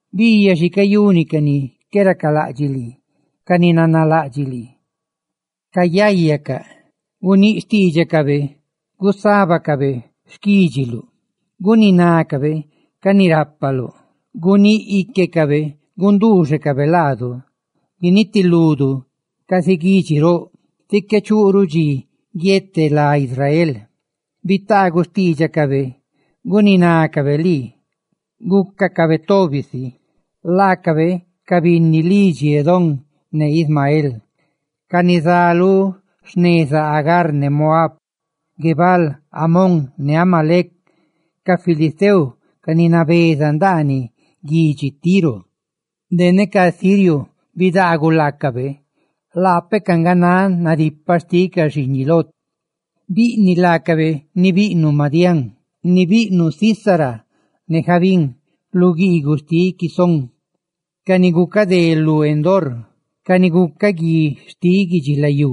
Biiyaꞌ xi cayuni ca ni qué racalaꞌdxiꞌ lii, ca ni nanalaꞌdxiꞌ lii; cayayacaꞌ luguialuꞌ. Guníꞌ xtiidxacabe gusábacabe xquídxiluꞌ, ¡guninácabe ca ni rápaluꞌ! Guníꞌ íquecabe gunduuxecabe laadu guinitiludu casi guidxi roꞌ, tí qué chuꞌruꞌ dxi guiete lá Israel. Bitaaguꞌ xtiidxacabe guninácabe lii, gúcacabe tobi si: laacabe ca binni lidxi Edom ne Ismael, ca ni zá lu xneza Agar ne Moab, Guebal, Amón ne Amalec, ca filisteo, ca ni nabeza ndaaniꞌ guidxi Tiro, de ne ca asirio bidaaguꞌ laacabe, laapecaꞌ nga náꞌ nadipaꞌ xtiꞌ ca xiiñiꞌ Lot. Biꞌniꞌ laacabe ni biꞌnuꞌ Madián, ni biꞌnuꞌ Sísara, casi bíꞌniluꞌ Jabín lu guiiguꞌ xtiꞌ Quisón, ca ni gucadé lu Endor, ¡ca ni gucaꞌ guiꞌ xtiꞌ guidxilayú!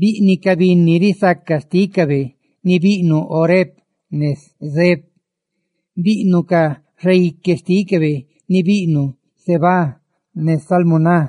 Biꞌniꞌ ca binni risaca xtícabe ni biꞌnuꞌ Oreb ne Zeeb; biꞌniꞌ ca xaique xtícabe ni biꞌnuꞌ Zébah ne Salmuná,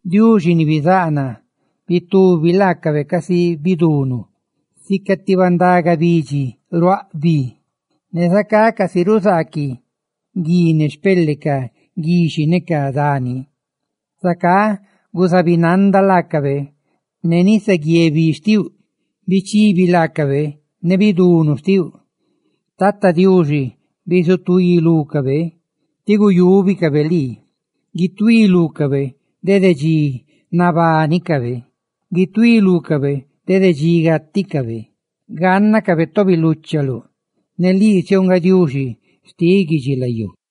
Diuxi ni bizáꞌ naa, bitubi laacabe casi bidunu, sica ti bandaga bidxi ni ruaꞌ bi; ne zacá casi ruzaaquiꞌ gui ne xpele ca guiꞌxhiꞌ ne rugazeguí ca dani, ¡zacá guzabinanda laacabe ne nisaguié bi xtiuꞌ ne bichibi laacabe ne bidunu xtiuꞌ! ¡Tata Diuxi, bisutuí lúcabe, tí guyúbicabe lii! Guituí lúcabe dede dxi nabánicabe; ¡guituí lúcabe dede dxi gáticabe! ¡Gánnacabe tobi luchaluꞌ, ne lii siouꞌ nga Tata Diuxi lu guidubi guidxilayú!